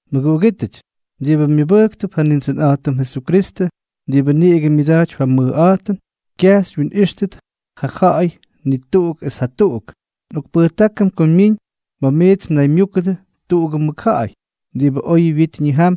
Mʉguꞌugítʉty diꞌibʉ myʉbʉjktʉp ja Nindsʉnꞌa̱jtʉm Jesukristʉ diꞌibʉ niꞌigʉ myʉda̱jtypy ja mʉjꞌa̱jtʉn, kyaj xywyinꞌíxtʉt ja ja̱ꞌa̱y ni tuꞌuk es jatuꞌuk. Nꞌokpʉjtákʉm ko myiñ ma̱ miits mnaymyúkʉdʉ tuꞌugʉ mʉkja̱ꞌa̱y diꞌibʉ oyʉ wyit ñijam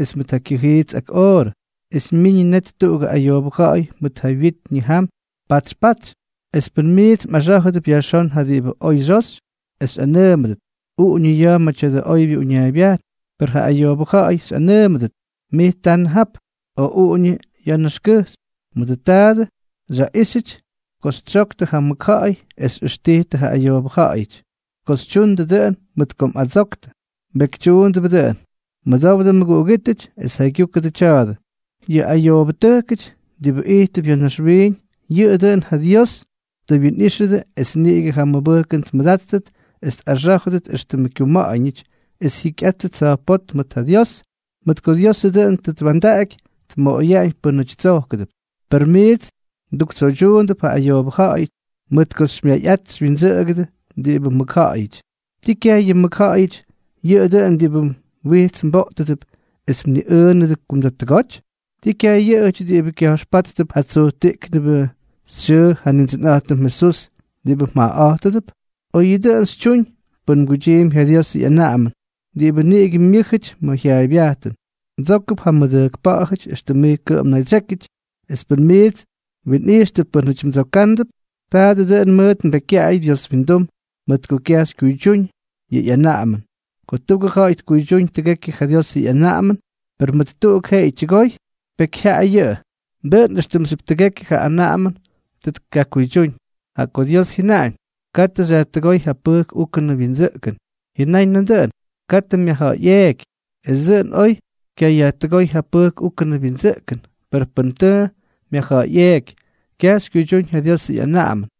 es mʉt ja kyʉjiits ak oorʉ, es myiñʉ net tuꞌugʉ ayoobʉ ja̱ꞌa̱y mʉt ja wyit ñijam patsy patsy, es pʉn miits mꞌaxá̱jʉdʉp yajxón ja diꞌibʉ oy xyoxy, es xyꞌanʉʉmʉdʉt: “Uꞌuñʉ ya̱a̱ ma̱ tya̱dʉ oybyʉ uñaaybyajn”, per ja ayoobʉ ja̱ꞌa̱y xyꞌanʉʉmʉdʉt: “Mij tanʉ jap”, o “Uꞌuñʉ ya̱a̱ naxkʉjxy”, mʉdʉ taadʉ xyaꞌíxyʉty ko xytsyoktʉ ja mʉkja̱ꞌa̱y es xyꞌʉxtijtʉ ja ayoobʉ ja̱ꞌa̱yʉty. Ko xytyundʉ dʉꞌʉn mʉt ko mꞌadsoktʉ, mbekytyuundʉbʉ dʉꞌʉn. Mʉdowdʉ mʉguꞌugítʉty es jaygyúkʉdʉ tya̱a̱dʉ. Yʉ ayoobʉtʉjkʉty diꞌibʉ ijttʉp ya̱ naxwiiñ, yʉꞌʉ dʉꞌʉn ja Dios tʉ wyinꞌíxʉdʉ es niꞌigʉ ja mʉbʉjkʉn tmʉdáttʉt es tꞌaxá̱jʉdʉt éxtʉmʉ kyuma̱ꞌa̱ñʉty es jyikyꞌátʉt tsa̱jpótm mʉt ja Dios, mʉt ko Diosʉ dʉꞌʉn tʉ twa̱ndaꞌaky tmoꞌoyaꞌañ pʉnaty tsojkʉdʉp; per miits mduktsoydyuundʉp ja ayoobʉ ja̱ꞌa̱yʉty, mʉt ko xymyayꞌat xywyindsʉꞌʉgʉdʉ diꞌibʉ mʉkja̱ꞌa̱yʉty. ¿Ti kyaj yʉ mʉkja̱ꞌa̱yʉty yʉꞌʉ dʉꞌʉn diꞌibʉ mwijts mboꞌtʉdʉp es mniꞌʉʉnʉdʉ kumda̱ttʉgoty? ¿Ti kyaj yʉꞌʉjʉty diꞌibʉ kya̱jxpáttʉp ja tsujtiꞌknʉbʉ xyʉʉ ja Nindsʉnꞌa̱jtʉm Jesús diꞌibʉ mjaꞌaꞌa̱jtʉdʉp? Oyʉ dʉꞌʉn xytyuñ pʉn mguydyiimpy ja Diosʉ ꞌyanaꞌamʉn diꞌibʉ niꞌigʉ myʉ́jʉty ma̱ jyaaybyajtʉn: “Mdsókʉp ja mmʉdʉjkpa̱ꞌa̱jʉty éxtʉm mij kʉꞌʉm mnaydsyékyʉty.” Es pʉn miits mwinꞌijxtʉp pʉ́nʉty mdsokándʉp, taadʉ dʉꞌʉn mʉʉt mbekykyaꞌay Dios windum mʉt ko kyaj xykyuydyúñ yʉ ꞌyanaꞌamʉn. Ko tuꞌugʉ ja̱ꞌa̱y tkuydyúñ tʉgekyʉ ja Diosʉ ꞌyanaꞌamʉn, per mʉt tuꞌuk jeꞌeyʉ tyʉgoy, pekyjyaꞌay yʉꞌʉ, dʉꞌʉn éxtʉmxyʉp tʉgekyʉ ja anaꞌamʉn tʉ tkakuydyúñ. Jaꞌa ko Dios jyʉnáñ: “Katʉ xyajtʉgóy ja pʉjk úkʉnʉ wyindsʉꞌkʉn”, jyʉnáñ nandʉꞌʉn: “Katʉ myajja̱ꞌa̱yꞌeeky.” Es dʉꞌʉn, oy xykyayajtʉgóy ja pʉjk úkʉnʉ wyindsʉꞌkʉn, per pʉn tʉ myajja̱ꞌa̱yꞌeeky, kyaj xykyuydyúñ ja Diosʉ ꞌyanaꞌamʉn.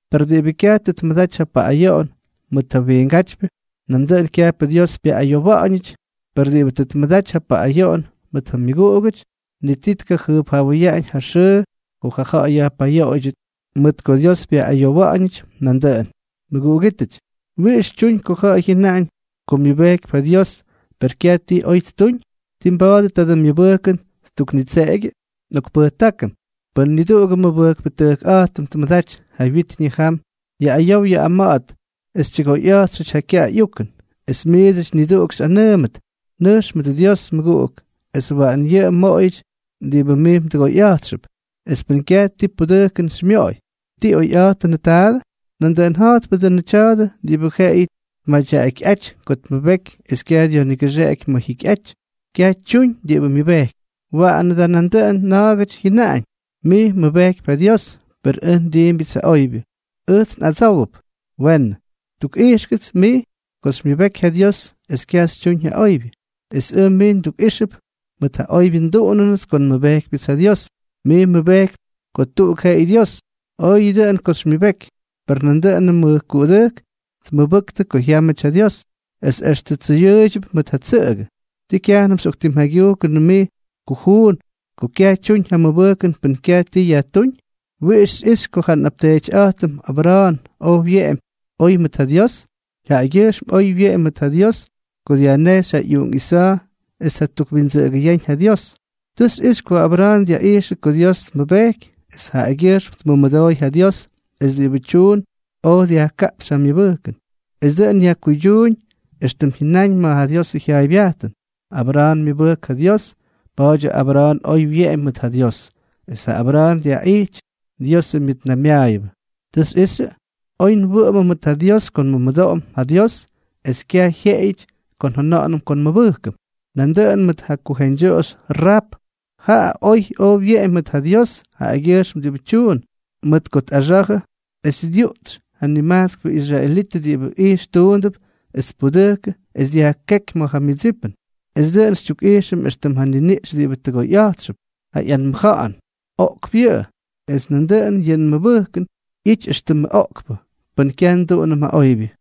Pes diꞌibʉ kyaj tʉ tmʉdaty ja paꞌꞌayoꞌon mʉt ja wiingátypyʉ, nandʉꞌʉn kyajpʉ Dios pyaꞌꞌayowa̱ꞌa̱ñʉty; per diꞌibʉ tʉ tmʉdaty ja paꞌꞌayoꞌon mʉt ja myʉguꞌugʉty, ni ti tkajʉjpjawʉyaꞌañ ja xʉʉ ko ja ja̱ꞌa̱y yajpayoꞌoydyʉt, mʉt ko Dios pyaꞌꞌayowa̱ꞌa̱ñʉty nandʉꞌʉn. Mʉguꞌugítʉty, ¿wiꞌix tyuñ ko ja̱ꞌa̱y jyʉnaꞌañ ko myʉbejkypy ja Dios, per kyaj ti oy ttuñ? ¿Tii mba̱a̱dʉ tadʉ myʉbʉjkʉn ttuknitseꞌegyʉ? Nꞌokpʉjtákʉm, pʉn niduꞌugʉ nmʉmʉbʉjkpʉꞌa̱jtʉm tmʉdaty ja wyit ñijam yaꞌꞌayow yaꞌꞌama̱ꞌa̱t es tyʉgoyꞌa̱jtxʉty ja kyaꞌay ꞌyukʉn, es miidsʉty niduꞌuk xyꞌanʉʉmʉt: “Nʉjx mʉdʉ Dios, mʉguꞌuk, es waꞌan yʉꞌʉ mmoꞌoyʉty diꞌibʉ mij mdʉgoyꞌa̱jtxʉp”, es pʉn kyaj ti pudʉjkʉn xymyoꞌoy, ¿ti oyꞌa̱jtʉnʉ taadʉ? Nandʉꞌʉn ja̱jtpʉ dʉnʉ tya̱a̱dʉ diꞌibʉ jeꞌeyʉ tmadyaꞌakyꞌáty ko tmʉbeky es kyaj dyajnigʉxeꞌeky ma̱ jyikyꞌaty, kyaj tyuñ diꞌibʉ myʉbejkypy. Waꞌanʉ da nandʉꞌʉn na̱a̱gʉty jyʉnaꞌañ: “Mij mmʉbejkypy ja Dios, per ʉj ndiimbyʉts ja oybyʉ.” Ʉjts nꞌadsówʉp: “Weenʉ, tukꞌijxkʉts mij ko xymyʉbeky ja Dios es kyaj xytyuñ ja oybyʉ, es ʉj mij ndukꞌíxʉp mʉt ja oybyʉ nduꞌunʉnʉts ko nmʉbejkypyʉts ja Dios.” Mij mmʉbejkypy ko tuꞌuk jeꞌeyʉ Dios. Oyʉ dʉꞌʉn ko xymyʉbeky; per nandʉꞌʉnʉ mʉjkuꞌudʉjk tmʉbʉktʉ ko jyámʉty ja Dios, es extʉ tsʉyʉʉydyʉp mʉt ja tsʉꞌʉgʉ. ¿Tii kyajnʉm xyꞌoktimjaygyujkʉnʉ mij kujuun, ko kyaj tyuñ ja mʉbʉjkʉn pʉn kyaj ti yajtúñ? ¿Wiꞌix xyꞌixy ko ja nꞌapteetyꞌa̱jtʉm Abra̱a̱n oj wyeꞌemy oy mʉt ja Dios? Jaꞌagyʉjxm oy wyeꞌemy mʉt ja Dios ko dyajnejxy ja ꞌyuꞌunk Isa̱a̱ es tjatukwindsʉꞌʉgʉyáñ ja Dios. Tʉ xyꞌixy ko Abra̱a̱n dyaꞌijxʉ ko Dios tmʉbejky es jaꞌagyʉjxm tmʉmʉdooy ja Dios, es diꞌibʉ tyuun oj dyajkaꞌpxy ja myʉbʉjkʉn. Es dʉꞌʉn yajkuydyuuñ éxtʉm jyʉnaꞌañ ma̱ ja Diosʉ jyaaybyajtʉn: “Abra̱a̱n myʉbʉjk ja Dios, pa̱a̱dyʉ Abra̱a̱n oy wyeꞌemy mʉt ja Dios”, es ja Abra̱a̱n yajtijy Diosʉ myʉtnaymyaayʉbʉ. ¿Tʉ xyꞌixyʉ? Oy nwʉꞌʉmʉm mʉt ja Dios ko nmʉmʉdoꞌom ja Dios es kyaj jyeꞌeyʉty ko njʉna̱ꞌa̱nʉm ko nmʉbʉjkʉm. Nandʉꞌʉn mʉt ja kujeñdyoꞌoxy Raap. Jaꞌa oy oj wyeꞌemy mʉt ja Dios jaꞌagyʉjxm diꞌibʉ tyuun, mʉt ko tꞌaxa̱jʉ es dyuꞌtsy ja nimajtskpʉ israelitʉ diꞌibʉ ijxtuundʉp, es tpudʉjkʉ es dyajkéky ma̱ ja myʉdsipʉn. Es dʉꞌʉn xytyukꞌijxʉm éxtʉm ja niniꞌx diꞌibʉ tʉgoyꞌa̱jtxʉp ja ꞌyanmʉja̱ꞌa̱n, oꞌkpʉ yʉꞌʉ, es nandʉꞌʉn yʉ nmʉbʉjkʉn ꞌyity éxtʉmʉ oꞌkpʉ, pʉn kyaj nduꞌunʉm ja oybyʉ.